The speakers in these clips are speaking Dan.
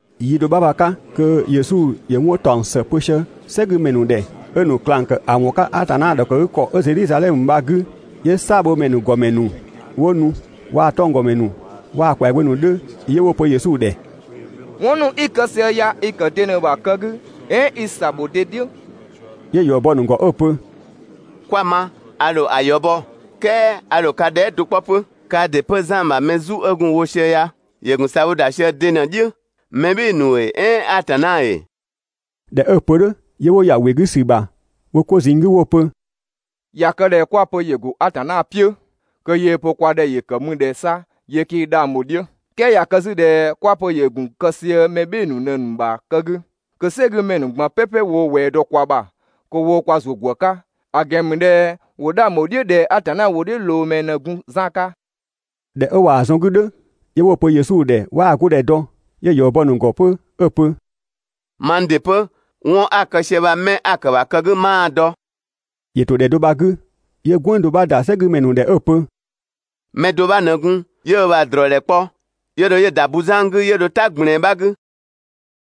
Yi do 'bha bha‑ 'ka kö Yesu ‑yö 'wɔn ‑taɔng ‑së pö sië "sɛgümɛ ‑nu ‑dhɛ, 'ö‑ ‑nu ꞊klang ‑kë ‑a ‑wɔn 'ka Atanna ‑dhɔkëgükɔ 'ö Zedhizadhɛmö bha‑ 'gü, 'yö "saabhomɛ ‑nu ‑gɔmɛ ‑nu 'wo nu waa‑ 'tɔnggɔmɛ ‑nu waa‑ ‑kwɛagbö ‑nu 'dhö, 'yö 'wo‑ pö Yesu ‑dhɛ: «'Wɔn ‑nu 'i‑ kë sië ya i‑ ‑kë de ꞊në‑ ‑bha kë 'gü "ɛɛn i‑ ‑sabho de "dhiʋ̈?» 'Yö ‑yɔ bɔ‑ ‑nu ‑gɔ 'ö‑ pö: «'Kwa‑ ma, a ‑dho ‑a ‑yɔ bɔ, "kɛɛ a ‑dho ka dhɛɛ" do 'kpɔ 'pö. Kaa ‑dɩ 'pö Zan ‑bha mɛ ‑bɔ Atanna 'ka ‑zʋ 'ö gun‑ wo sië ya, ‑yö ‑gun ‑sabho sië de ꞊në‑ "dhiʋ̈? Mɛ "bhɩɩ‑ ‑nu ‑ee, "ɛɛn Atanna ‑ee?» ꞊Dhɛ 'ö‑ pö "dhʋ̈, 'yö 'wo ‑ya ‑wɩ 'gü ‑sü ‑bha wo 'ko ꞊zinng 'gü 'wo‑ pö: «Ya kë ꞊dhɛ 'kwa‑ pö ‑yö ‑go Atanna "piʋ̈, kö yöö‑ pö kwa ‑dhɛ yö kë ‑mü ꞊dhɛ 'sa 'yö 'kii 'dhang bho‑ "dhiʋ̈, "kɛɛ ꞊ya kë 'zü ꞊dhɛ 'kwa‑ pö ‑yö ‑gun kë sië mɛ "bhɩɩ‑ ‑nu ꞊në‑ ‑nu ‑bha kë 'gü, kö "sɛgümɛ ‑nu ꞊gban "pɛpɛ woo (꞊wɛɛ dɔ kwa ‑bha) kö ‑wo kwa ‑zuö ‑gwë 'ka, ‑a ‑gɛn ‑mü ꞊dhɛ ‑wo 'dhang ‑bho "dhiʋ̈ ꞊dhɛ Atanna ‑wʋdhiʋ̈loomɛ ꞊në gun Zan 'ka.» ꞊Dhɛ 'ö ꞊waa‑ zɔn‑ 'gü "dhʋ̈, 'yö 'wo‑ pö Yesu ‑dhɛ 'waa‑ 'go ‑dhɛ dɔ. 'Yö ‑yɔ bɔ‑ ‑nu ‑gɔ 'pö 'ö‑ pö: «Mang ‑dɩ 'pö, 'wɔn 'a‑ kë sië bha 'mɛ 'a‑ kë‑ ‑bha kë 'gü 'maa‑ dɔ.» ‑Yö ‑to ‑dhɛ bha‑ 'gü 'yö "gwënng do 'bha ‑da "sɛgümɛ ‑nu ‑dhɛ 'ö‑ pö: «Mɛ do 'bha ꞊në gun, 'yö ö ‑bha ‑drɔɔdhɛ kpɔ, 'yö dho 'yö‑ ‑da buzan 'gü 'yö dho "ta ꞊gblɛɛn 'bha 'gü.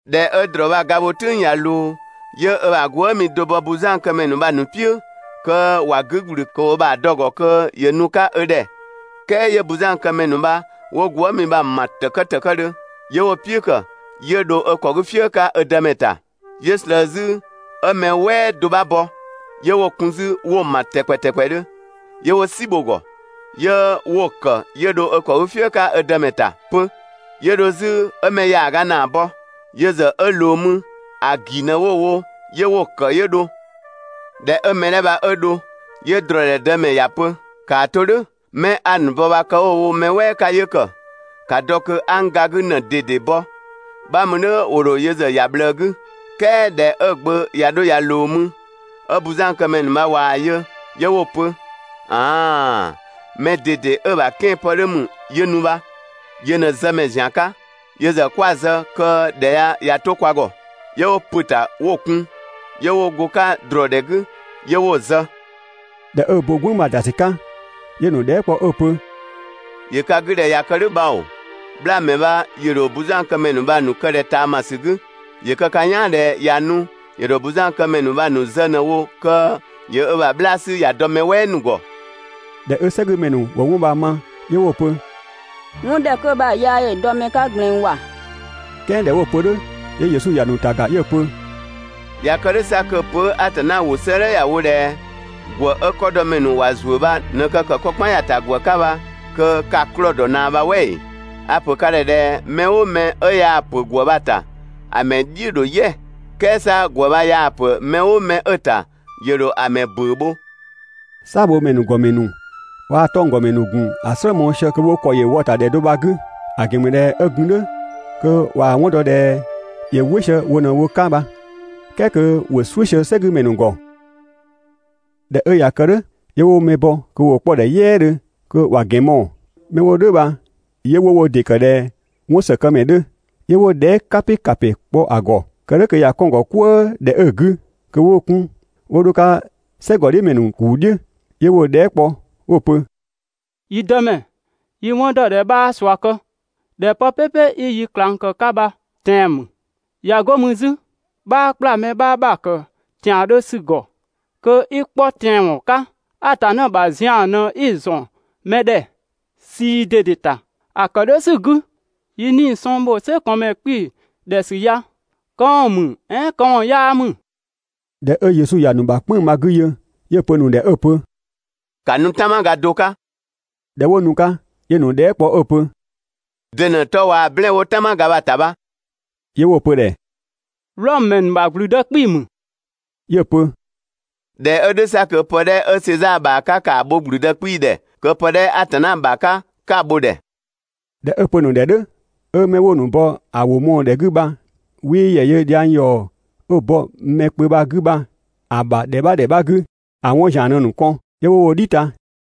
꞊Dhɛ 'ö ‑drɔɔ bha‑ ga bho "tʋ̈ng ꞊ya ꞊loo, 'yö ö ‑bha gwëëmi do bɔ buzankëmɛ ‑nu bha‑ ‑nu "piʋ̈, kö ‑wa 'gü ‑gblü kö ‑wo ö ‑bha dɔ‑ ‑gɔ kö ‑yö nu‑ 'ka ö ‑dhɛ, "kɛɛ 'yö buzankëmɛ ‑nu bha 'wo gwëëmi bha‑ ‑ma ‑tëkë ‑tëkëdhö, 'yö 'wo‑ "piʋ̈ kë 'yö dho ö ‑kɔ 'gü "fië 'ka ö dëmɛ ‑ta. 'Yö ꞊slëë 'zü 'ö mɛ "wɛɛ do 'bha bɔ, 'yö 'wo‑ kun 'zü 'wo‑ ‑ma ‑tɛkpɛ ‑tɛkpɛdhö, 'yö 'wo "si bho‑ ‑gɔ, 'yö 'wo‑ ‑kë 'yö dho ö ‑kɔ "fië 'ka ö dëmɛ ‑ta 'pö. 'Yö dho 'zü 'ö‑ mɛ ‑yaaga ‑naa bɔ. Yö ‑zë 'ö ꞊loo mü, ‑a ‑gi ꞊në 'wo‑ wo, 'yö 'wo‑ ‑kë 'yö dho. ꞊Dhɛ 'ö mɛ 'dhɛ bha 'ö dho, 'yö ‑drɔɔdhɛ dëmɛ ‑ya pö: «‑Kaa 'to "dhʋ̈! 'Mɛ 'a‑ ‑nu bɔ bha kë 'wo‑ wo mɛ "wɛɛ 'ka 'yö ‑kë, ‑ka dɔ kö 'a n ga 'gü ꞊në ꞊dede bɔ, 'bha mü "dhʋ̈ ‑wo ‑dho yö ‑zë ‑ya ꞊bhlëë 'gü.» "Kɛɛ ꞊dhɛ 'ö‑ gbö ꞊ya 'dho ꞊ya ꞊loo mü, 'ö buzankëmɛ ‑nu bha ꞊waa‑ yö 'yö 'wo‑ pö: «‑An aaan‑! Mɛ ꞊dede 'ö‑ ‑bha 'kɛanpë 'dhö ‑mü 'yö nu bha, yö ꞊në zëmɛ ‑zian 'ka, yö ‑zë 'kwa‑ zë kö ‑dhɛ ya ꞊ya 'to kwa ‑gɔ!» 'Yö 'wo ‑pö ‑ta 'wo‑ kun 'yö 'wo go‑ 'ka ‑drɔɔdhɛ 'gü, 'yö 'wo‑ zë.» ꞊Dhɛ 'ö bo "gwënng bha‑ ‑da ‑sü 'ka, 'yö‑ ‑nu dhɛɛ" kpɔ 'ö‑ pö: «‑Yö ka 'gü ꞊dhɛ ꞊ya kë "dhʋ̈ bhao‑, 'bhlaamɛ bha ‑yö ‑dho buzankëmɛ ‑nu bha‑ ‑nu kë ꞊dhɛ ꞊taamasü 'gü? ‑Yö kë ka "yaan ꞊dhɛ ꞊ya nu, ‑yö ‑dho buzankëmɛ ‑nu bha‑ ‑nu zë ꞊në‑ wo kö ‑yö ö ‑bha 'bhlaa‑ 'sü ‑ya dɔ mɛ "wɛɛ ‑nu ‑gɔ. ꞊Dhɛ 'ö "sɛgümɛ ‑nu ‑wo 'wɔn bha‑ ma 'yö 'wo‑ pö: «'Wɔn 'dhɛ 'kö bha‑ yaa ‑yö dɔ mɛ 'ka ꞊gblɛɛn ‑wa.» "Kɛɛ ꞊dhɛ 'wo‑ pö "dhʋ̈, 'yö Yesu ‑ya ‑nu ‑ta ‑ga 'yö‑ pö: «꞊Ya kë "dhʋ̈ 'sa kö‑ pö 'ö Atanna ‑wʋ 'sëëdhɛ ‑ya wo ꞊dhɛ: ‹‑Gwë 'ö 'kɔdɔmɛ ‑nu ‑wa ‑zuö bha ꞊në kë ‑kë 'kɔ "kpan ‑ya ‑ta ‑gwë 'ka› bha kö ka‑ 'klɔɔ‑ ‑dɔ ꞊naa bha "wɛ ‑ee?» A‑ ‑pö ka ‑dhɛ ꞊dhɛ mɛ "ʋʋ mɛ 'ö yaa‑ ‑pö ‑gwë bha‑ ‑ta, ‑a ‑mɛ "dhiʋ̈ ‑dho "yɛ, "kɛɛ 'sa ‑gwë bha yaa‑ ‑pö mɛ "ʋʋ 'mɛ 'ö‑ ‑ta, ‑yö ‑dho ‑a ‑mɛ ‑bʋ̈ʋ̈ bho. "Saabhomɛ ‑nu ‑gɔmɛ ‑nu waa‑ 'tɔnggɔmɛ ‑nu ‑gun ‑a "slë mɔɔ‑ sië kö wo ‑kɔ yö wɔ‑ ‑ta ‑dhɛ do bha‑ 'gü, ‑a ‑gɛn ‑mü ꞊dhɛ 'ö gun "dhʋ̈ kö ꞊waa‑ 'wɔn dɔ ꞊dhɛ ‑yö "wɩ sië wo ꞊në wo 'ka bha, "kɛɛ kö ‑wo "suʋ̈ sië "sɛgümɛ ‑nu ‑gɔ. ꞊Dhɛ 'ö ꞊ya kë "dhʋ̈, 'yö 'wo mɛ bɔ kö ‑wo 'kpɔ‑ ‑dhɛ "yɛɛdhö kö ‑wa ‑gɛn mɔɔ‑. 'Mɛ 'wo "dhʋ̈ bha, 'yö 'wo wo ‑dɩ ‑kë ꞊dhɛ 'wɔnsëkëmɛ 'dhö, 'yö 'wo dhɛɛ" "kapɩ ‑kapɩ ‑nu kpɔ‑ ‑gɔ, kë "dhʋ̈ kö ꞊ya 'kɔn‑ ‑gɔ "kwëë ‑dhɛ 'ö‑ 'gü kö 'wo‑ 'kun 'wo 'dho‑ 'ka "sɛgɔdhiʋ̈mɛ ‑nu ‑kuu "dhiʋ̈. 'Yö 'wo‑ dhɛɛ" kpɔ 'wo‑ pö: «Yi Dëmɛ, yi 'wɔn ‑dɔ ꞊dhɛ 'bhaa ꞊sua kë, ꞊dhɛ pë "pɛpɛ 'i yi ꞊klang ‑kë 'ka bha tɛan‑ ‑mü, ꞊ya 'go mü 'zü, 'bhaa ‑kpla mɛ 'bha ‑bha ‑kë ‑tiandhö ‑sü ‑gɔ kö i 'kpɔ tɛanwɔn 'ka, Atanna ‑bha zian ꞊në 'i‑ ‑zɔn mɛ ‑dhɛ ꞊sii ꞊dede ‑ta. ‑A ‑kë "dhʋ̈ ‑sü 'gü, yi 'nii‑ sɔng ‑bho "sɛkɔɔnmɛ 'kpii‑ ‑dhɛ ‑sü ya, këwɔn ‑mü "ɛɛn këwɔn 'yaa ‑mü?» ꞊Dhɛ 'ö Yesu ‑ya ‑nu ‑bha "kpënng‑ bha‑ 'gü yö, 'yö‑ pö‑ ‑nu ‑dhɛ 'ö‑ pö: «‑Ka nu "tanmaga do 'ka!» ꞊Dhɛ 'wo nu‑ 'ka, 'yö‑ ‑nu dhɛɛ" kpɔ 'ö‑ pö: «De ꞊në‑ 'tɔ waa‑ "blɛɛn‑ 'wo "tanmaga bha‑ ‑ta bha?» 'Yö 'wo‑ pö‑ ‑dhɛ «Wlɔmö ‑mɛ ‑nu ‑bha ‑gblüdë 'kpii‑ ‑mü.» 'Yö‑ pö: «꞊Dhɛ 'ö "dhʋ̈ 'sa kö pë 'dhɛ 'ö Sezaa ‑bha 'ka, ‑kaa bho ‑gblüdë 'kpii‑ ‑dhɛ, kö pë 'dhɛ Atanna ‑bha 'ka 'ka‑ bho‑ ‑dhɛ!» ꞊Dhɛ 'ö‑ pö‑ ‑nu ‑dhɛ "dhʋ̈, 'ö 'mɛ 'wo‑ ‑nu bɔ ‑a ‑wʋ mɔɔ‑ ‑dhɛ 'gü bha 'wii ‑yɛ yö dhiang ‑yɔ 'ö‑ bɔ mɛ kpö bha‑ 'gü bha‑ ‑bha ‑dhɛ 'bha ‑dhɛ 'bha 'gü, ‑a 'wɔn ‑zian ꞊në‑ ‑nu kɔn, 'yö 'wo wo "dhi ta.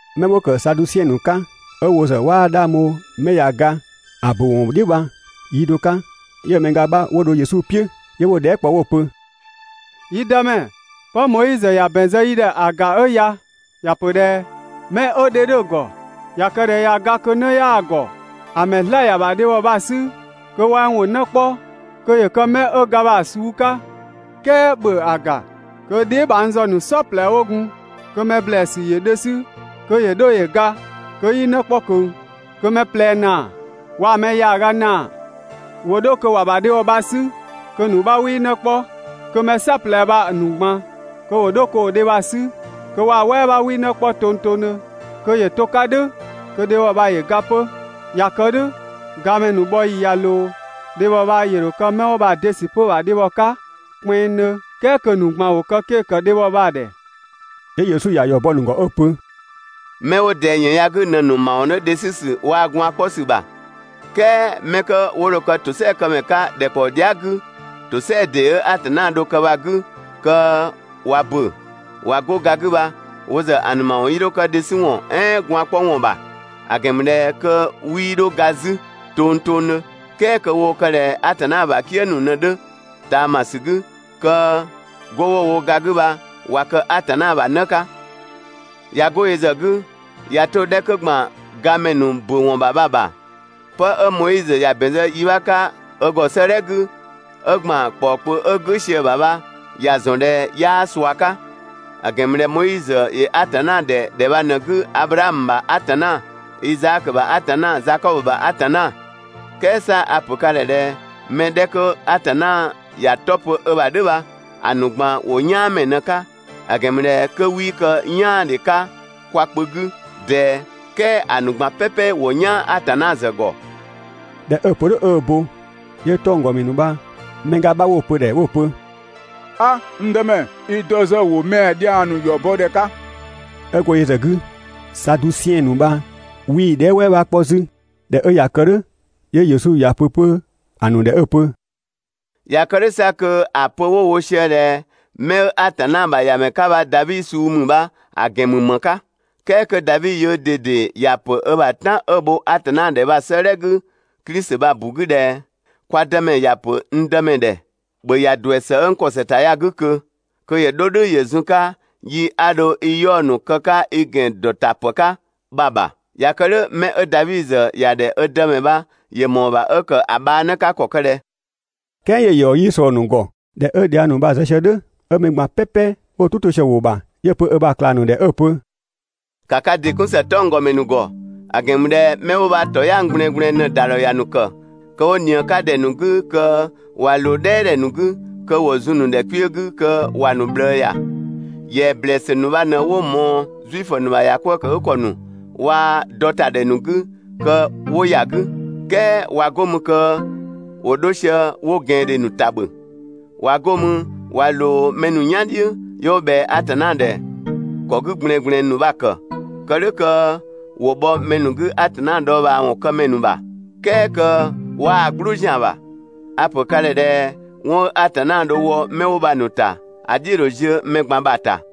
'Mɛ 'wo ‑kë Sadusiɛn ‑nu 'ka, 'ö 'wo ‑zë 'waa 'dhang bho 'mɛ ꞊ya ga ‑a ‑bö ‑wɔn "dhiʋ̈ bha, yi do 'ka 'yö‑ mɛ ga 'bha 'wo dho Yesu "piʋ̈, 'yö 'wo‑ dhɛɛ" kpɔ 'wo‑ pö: «Yi Dëmɛ, 'pë Moizö ‑ya ‑bɛn zë yi ‑dhɛ ‑a ‑ga 'ö ya, ‑ya pö ꞊dhɛ: ‹'Mɛ 'ö dhe 'dhö‑ ‑gɔ, ꞊ya kë ꞊dhɛ ꞊ya ga kö 'në 'yaa‑ ‑gɔ, ‑a ‑mɛ 'zlaa‑ ‑ya ‑bha dhebhɔ bha‑ 'sü kö wɛng ‑wo 'në 'kpɔ, kö ‑yö kë 'mɛ 'ö ga bha‑ suu 'ka.› "Kɛɛ ‑bhö ‑a ‑ga kö dheebhang ‑zë ‑nu "saɔplɛ 'wo gun, kö mɛ ‑blɛɛsü ‑yö dhe 'sü kö ‑yö 'dho ‑yö ga kö 'yii 'në 'kpɔ ꞊kö. Kö‑ mɛ ꞊plɛ ‑naa waa‑ mɛ ‑yaaga ‑naa ‑wo 'dho kö ‑wa ‑bha dhebhɔ bha‑ 'sü kö‑ ‑nu 'bha 'wii 'në 'kpɔ. Kö mɛ "saɔplɛ bha‑ ‑nu ꞊gban ‑wo 'dho kö ‑wo dhe bha‑ 'sü kö waa‑ "wɛɛ 'bha 'wii 'në 'kpɔ tongtongdhö. Kö ‑yö to‑ 'ka "dhʋ̈ kö‑ dhebhɔ bha ‑yö ga 'pö. ꞊Ya kë "dhʋ̈, gamɛ ‑nu bhɔ ‑yi bha ꞊ya ꞊loo, dhebhɔ bha ‑yö ‑dho kë 'mɛ 'wo bha‑ de ‑sü 'pö‑ ‑bha dhebhɔ 'ka kpɛnngdhö, "kɛɛ kö ‑a ‑nu ꞊gban ‑wo kë 'ke‑ ‑kë dhebhɔ bha‑ ‑dhɛ.» 'Yö Yesu ‑ya ‑yɔ bɔ‑ ‑nu ‑gɔ 'ö‑ pö: «'Mɛ 'wo ꞊dɛɛ ‑yën ya‑ 'gü ꞊në‑ ‑nu ‑mawɔn 'dhö dhe 'sü ‑sü waa‑ gwaan‑ 'kpɔ ‑sü ‑bha, "kɛɛ 'mɛ 'kö 'wo dho kë ‑tosɛakëmɛ 'ka ‑dhɛkpaɔ dhia" 'gü, ‑tosɛa ‑dee 'ö Atanna dho‑ kë bha‑ 'gü kö ꞊wa ‑bö ꞊wa 'go ga 'gü bha, wo ‑zë ‑a ‑nu ‑mawɔn 'yii 'dho kë dhe 'sü ‑wɔn "ɛɛn gwaan‑ 'kpɔ ‑wɔn ‑bha; ‑a ‑gɛn ‑mü ꞊dhɛ kö 'wii 'dho ga 'zü tongtongdhö, "kɛɛ kö woo kë ꞊dhɛ Atanna ‑bha "kië ‑nu ꞊në 'dhö ꞊taamasü 'gü, kö 'go 'wo‑ wo ga 'gü bha ꞊wa kë Atanna ‑bha 'në 'ka. ꞊Ya 'go yö ‑zë 'gü, ꞊ya 'to‑ 'dhɛ 'kö ‑gban gamɛ ‑nu ‑bö ‑wɔn ‑bha bha‑ ‑bha, 'pë 'ö Moizö ‑ya ‑bɛn zë yi 'bha 'ka ö ‑gɔ 'sëëdhɛ 'gü, 'ö ‑gban ‑kpɔɔ kpö 'ö "gʋ̈ sië‑ ‑bha bha ‑ya ‑zɔn ꞊dhɛ 'yaa ꞊sua 'ka; ‑a ‑gɛn ‑mü ꞊dhɛ Moizö ‑yö Atanna ‑dhɛ ‑dhɛ bha ꞊në‑ 'gü Ablaamö ‑bha Atanna, Izaakö ‑bha Atanna, Zakɔbö ‑bha Atanna. "Kɛɛ 'sa a‑ ‑pö ka ‑dhɛ ꞊dhɛ mɛ 'dhɛ 'kö Atanna ‑ya 'tɔ pö ö ‑bha "dhʋ̈ bha, ‑a ‑nu ꞊gban ‑wo "yaanmɛ ꞊në‑ 'ka, ‑a ‑gɛn ‑mü ꞊dhɛ 'kö 'wii kë "yaandhe 'ka kwa kpö 'gü ꞊dɛɛ, "kɛɛ ‑a ‑nu ꞊gban "pɛpɛ ‑wo "yaan Atanna ‑zë ‑gɔ.» ꞊Dhɛ 'ö‑ pö "dhʋ̈ 'ö ö bo, 'yö 'tɔnggɔmɛ ‑nu bha‑ mɛ ga 'bha 'wo‑ pö‑ ‑dhɛ 'wo‑ pö: «'A, n Dëmɛ, i dɔ ‑zë ‑wo mɛa‑ dhiang ‑nu ‑yɔ bɔ ‑dhɛ 'ka.» 'Ö go yö ‑zë 'gü, Sadusiɛn ‑nu bha 'wii‑ dhɛɛ" "wɛɛ 'bha 'kpɔ 'zü. ꞊Dhɛ 'ö ꞊ya kë "dhʋ̈, 'yö Yesu ‑ya pö 'pö‑ ‑nu ‑dhɛ 'ö‑ pö: «꞊Ya kë "dhʋ̈ 'sa kö ‑a pö 'wo‑ wo sië ꞊dhɛ 'mɛ 'ö Atanna ‑bha ‑Yamɛ 'ka bha Davi suu ‑mü bha‑ ‑gɛn ‑mü ‑më 'ka, "kɛɛ kö Davi yöö ꞊dede ‑ya ‑pö ö ‑bha "tan 'ö‑ bho Atanna ‑dhɛ bha‑ 'sëëdhɛ 'gü Klisi bha‑ ‑bu 'gü ꞊dhɛ: ‹Kwa Dëmɛ ‑ya ‑pö n Dëmɛ ‑dhɛ: ‑Bhö ‑ya ‑duɛ ‑së 'ö n ‑kɔ ‑së ‑ta ya‑ 'gü ꞊kö kö ‑yö 'dho "dhʋ̈ ‑yö zun‑ 'ka yi 'a dho i 'yaɔ‑ ‑nu kë‑ 'ka i ‑gɛn ‑dɔ ‑ta ‑pë 'ka› bha‑ ‑bha. ꞊Ya kë "dhʋ̈ 'mɛ 'ö Davi ‑zë ‑ya ‑dhɛ ö Dëmɛ bha ‑yö ‑mɔɔ ‑bha 'ö ‑kë ‑a bhaa 'në 'ka ‑kɔ ‑kë ꞊dhɛ? ("Kɛɛ 'yö‑ ‑yɔ 'yii ꞊slɔɔ‑ ‑nu ‑gɔ.) ꞊Dhɛ 'ö dhiang ‑nu bha‑ ‑nu zë sië "dhʋ̈, 'ö mɛ ꞊gban "pɛpɛ 'wo "tʋ 'to sië‑ ‑wʋ ‑bha, 'yö‑ pö ö ‑bha ꞊klang ‑nu ‑dhɛ 'ö‑ pö: «‑Ka ka ‑dɩ 'kun ‑së 'tɔnggɔmɛ ‑nu ‑gɔ! ‑A ‑gɛn ‑mü ꞊dhɛ 'mɛ 'wo bha ‑tɔyang ꞊gblɛɛngblɛɛn ꞊në‑ ‑da ‑dhɔ ‑ya ‑nu ‑kë kö 'wo ꞊nië‑ 'ka ‑dhɛ ‑nu 'gü kö 'wa ꞊loo "dhɛɛdhɛ ‑nu 'gü kö ‑wo zun‑ ‑nu ‑dhɛ kpiö 'gü kö ‑wa ‑nu ꞊bhlëë ‑ya. ‑Yɛa ‑blɛɛsü ‑nu bha ꞊në 'wo‑ ꞊mɔɔ Zuifö ‑nu ‑bha ‑yakwëëkëgükɔ ‑nu waa‑ dɔtadhɛ ‑nu 'gü kö 'wo ‑ya 'gü. "Kɛɛ ꞊wa 'go mü kö ‑wo 'dho sië 'wo ꞊gɛandhe ‑nu ‑ta ‑bhö, ꞊wa 'go mü ꞊wa ꞊loo mɛ ‑nu "yan "dhiʋ̈, 'yö 'wo ꞊bhɛa Atanna ‑dhɛ ‑kɔ 'gü ꞊gblɛɛngblɛɛn ‑nu bha‑ ‑kë, (kë "dhʋ̈, kö 'wo bhɔ mɛ ‑nu 'gü Atanna dhɔɔbhaawɔn kë ‑mɛ ‑nu ‑bha, "kɛɛ kö 'waa‑ "gblʋʋ ‑zian ‑bha). A‑ ‑pö ka ‑dhɛ ꞊dhɛ 'wɔn 'ö Atanna dho‑ wɔ 'mɛ 'wo bha‑ ‑nu ‑ta, ‑a "dhiʋ̈‑ ‑dho ziö mɛ ꞊gban ‑bha ‑ta.